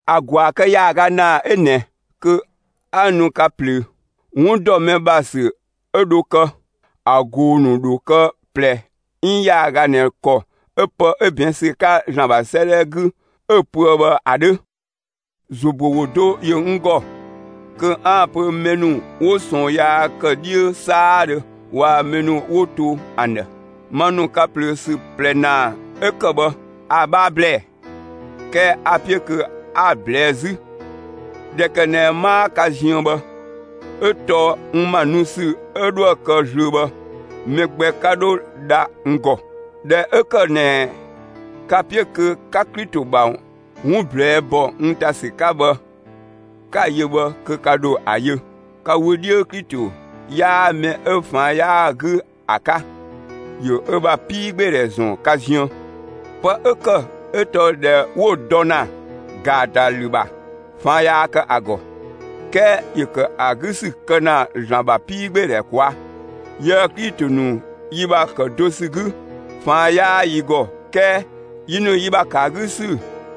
‑A ‑gwaa kë ‑yaaga ‑naa 'ö ꞊nɛ kö 'a nu ka ꞊plöö. 'Wun ‑dɔ mɛ ‑bha ‑sü 'ö dho kë, ‑a ꞊goo‑ ‑nu ‑dho kë ꞊plɛ 'iin ‑yaaga ꞊nɛ ‑kɔ 'ö pë 'ö ꞊bɛɛn' ‑sü 'ka ‑Zlan ‑bha 'sëëdhɛ 'gü 'ö‑ pöë bhë ‑a 'dhö. ‑Zo ‑büö ‑wo do ‑yö n ‑gɔ kö 'aan‑ pö mɛ ‑nu 'wo ꞊sɔɔn yaa ‑kë 'dhiö 'saadhö waa‑ mɛ ‑nu 'wo to ‑an ‑dhë. Ma ‑nu ka ꞊plöö ‑sü ꞊plɛ ‑naa 'ö ‑kë bhë, a‑ 'bhaa ‑blɛɛ. 'Kɛɛ a‑ 'piö kö 'a‑ ꞊blɛɛ' 'zü, ꞊dhɛ kë ꞊nɛ 'maa ka ziën bhë; 'ö tɔɔ n ‑ma nu ‑sü 'ö 'dhoë‑ kë zlöö bhë, mɛ gbɛ 'ka dho dha n ‑gɔ. ꞊Dhɛ 'ö ‑kë ꞊nɛ ka‑ 'piö kö 'ka Klito ‑bha 'wun ꞊blɛɛ'‑ ‑bɔ n ‑ta ‑sü 'ka bhë 'ka‑ yö bhë, kö ka ‑dho ‑a yö. Ka wö 'dhiö, Klito 'yaa mɛ 'ö ꞊faan' 'yaa‑ 'gü ‑a 'ka. ‑Yö ö ‑bha 'piigbeedhɛ ‑zɔn ka ziën. Pë 'ö ‑kë 'ö tɔɔ ꞊dhɛ 'wo‑ dɔ ‑na ‑gaatalü ‑bha ꞊faan' yaa kë ‑a ‑gɔ, 'kɛɛ ‑yö ‑kë ‑a 'gü ‑sü kë ‑na ‑Zlan ‑bha 'piigbeedhɛ ꞊kwaa'. Yië‑ Klito ‑nu yi ‑bha ‑kë do ‑sü 'gü, ꞊faan' 'yaa yi ‑gɔ 'kɛɛ yi ‑nu yi ‑bha ‑kë ‑a 'gü ‑sü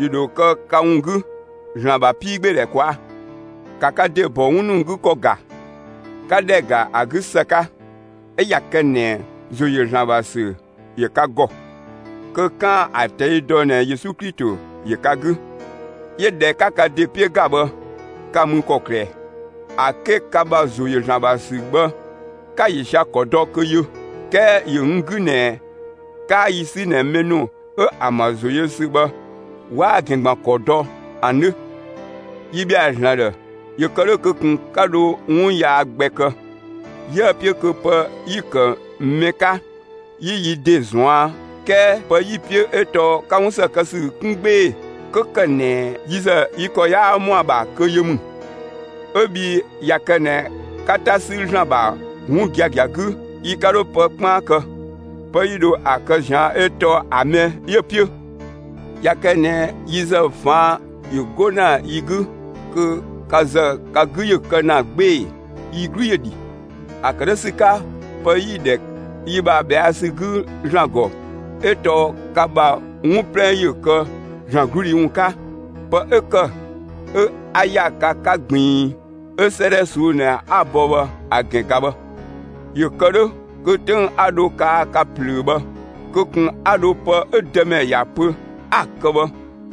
‑yö ‑dho kë ka ‑wun 'gü, ‑Zlan ‑bha 'piigbeedhɛ ꞊kwaa'. ‑Ka ka ‑de ‑bɔ 'wun ‑nu 'gü ‑kɔ ‑ga, 'ka ‑dhɛ ‑ga ‑a 'gü ‑së 'ka; 'ö ꞊ya kë ꞊nɛ ‑zo ‑yö ‑Zlan ‑bha ‑sü ‑yö ka ‑gɔ, kö 'kaan‑ ‑a ꞊tɛi' dɔ ꞊nɛ Yesu Klito ‑yö ka 'gü. 'Yö ꞊dhɛ 'ka ka ‑de 'piö ‑ga bhë, ka mü ‑kɔklë ꞊ɛ? ‑A 'ke ka ‑bha ‑zo ‑yö ‑Zlan ‑bha ‑sü bhë, 'ka‑ ‑yö sia‑ ‑kɔ dɔ kö yö. 'Kɛɛ ‑yö n 'gü ꞊nɛ 'kaa yi 'sü ꞊nɛ mɛ ‑nu 'ö ‑an ‑bha ‑zo yö ‑sü bhë 'waa‑ ‑gɛn ‑gban ‑kɔ dɔ ‑an 'dhö. Yi ‑bhɛa ‑Zlan ‑dhë ‑yö kë 'dhö kö ‑kun 'ka dho 'wun yaa gbɛ kë. 'Yië‑ 'piö kö pë 'yi‑ kë ‑mɛ 'ka, 'yi yi ‑de ꞊zuan'; 'kɛɛ pë 'yi‑ 'piö 'ö tɔɔ 'ka 'wun ‑së kë ‑sü 'kun 'gbee‑ 'kö ‑kë ꞊nɛ yi ‑zë yi ‑kɔ 'yaa ‑mɔa ‑bha kö yö ‑mü. 'Ö bhii ꞊ya kë ꞊nɛ 'ka 'ta 'sü ‑Zlan ‑bha 'wun giagia 'gü, yi 'ka dho pë 'kpaan kë; pë 'yi dho ‑a kë ꞊zian' 'ö tɔɔ ‑a mɛ 'yö‑ 'piö. ꞊Ya kë ꞊nɛ yi ‑zë ꞊faan' ‑yö 'go ‑na yi 'gü, kö ka ‑zë ka 'gü ‑yö kë ‑na 'gbee‑, yi 'glu ‑yö ‑dhi. ‑A ‑kë 'dhö ‑sü 'ka pë 'yi‑ ‑dhɛ yi ‑bha ꞊bhɛa' ‑sü 'gü ‑Zlan ‑gɔ, 'ö tɔɔ ka ‑bha 'wun 'plɛ ‑yö kë ‑Zlan 'gludhi ‑wun 'ka. Pë 'ö ‑kë 'ö 'a ‑ya ka 'ka ꞊gbiin 'ö 'sëëdhɛ ꞊suu'‑ ꞊nɛ 'a‑ bɔ bhë ‑a ‑gɛn ꞊ga bhë, ‑yö ‑kë 'dhö kö 'töng 'a dho kaa ka ꞊plöö bhë, kö ꞊kun 'a dho pë 'ö Dëmɛ ‑ya pö 'a‑ kë bhë,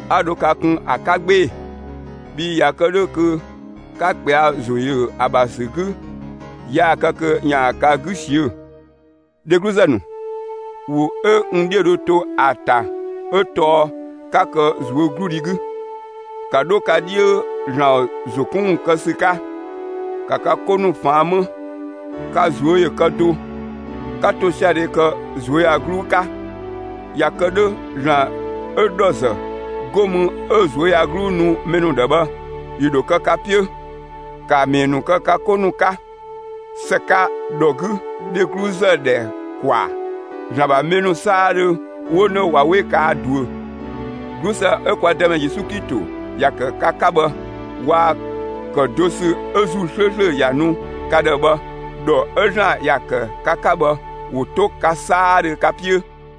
'a dho ka kun ‑a 'ka 'gbee‑. Bhii ‑ya ‑kë 'dhö kö 'ka ꞊kpɛa' ‑zo ‑yö ‑a ‑bha ‑sü 'gü; yaa‑ kë kö ‑yaan ka 'gü ꞊siö'‑. Dhegluzë ‑nu, ‑wo 'ö n 'dhiö dho to ‑a ‑ta 'ö tɔɔ 'ka kë ꞊zuögludhi 'gü; ‑ka 'dho ka 'dhiö ‑Zlan ‑zo 'kun ‑wun kë ‑sü 'ka, ‑ka ka 'ko ‑nu ꞊faan' 'më. Ka ꞊zuö' ‑yö kë do, 'ka ‑tosiadhe kë ꞊zuöyagluu 'ka. ‑Ya kë 'dhö ‑Zlan 'ö ‑dhɔzë 'go mü 'ö ꞊zuöyagluu nu mɛ ‑nu ‑dhë bhë, ‑yö ‑dho kë ka 'piö. ‑Ka ‑mɛɛ ‑nu kë ka 'ko ‑nu 'ka ‑së 'ka ‑dhɔ 'gü dhegluzë ‑dhɛ ‑kwaa. ‑Zlan ‑bha mɛ ‑nu 'saadhö 'wo 'nö ꞊wa 'we kaa ꞊duö. 'Glusë 'ö kwa Dëmɛ Yesu Klito ‑ya ‑kë ka 'ka bhë, waa‑ ‑kë do ‑sü 'ö ‑Zuu 'slööslö ‑ya ‑nu ka ‑dhë bhë, ‑dhɔ 'ö ‑Zlan ‑ya ‑kë ka 'ka bhë, ‑wo 'to ka 'saadhö ka 'piö.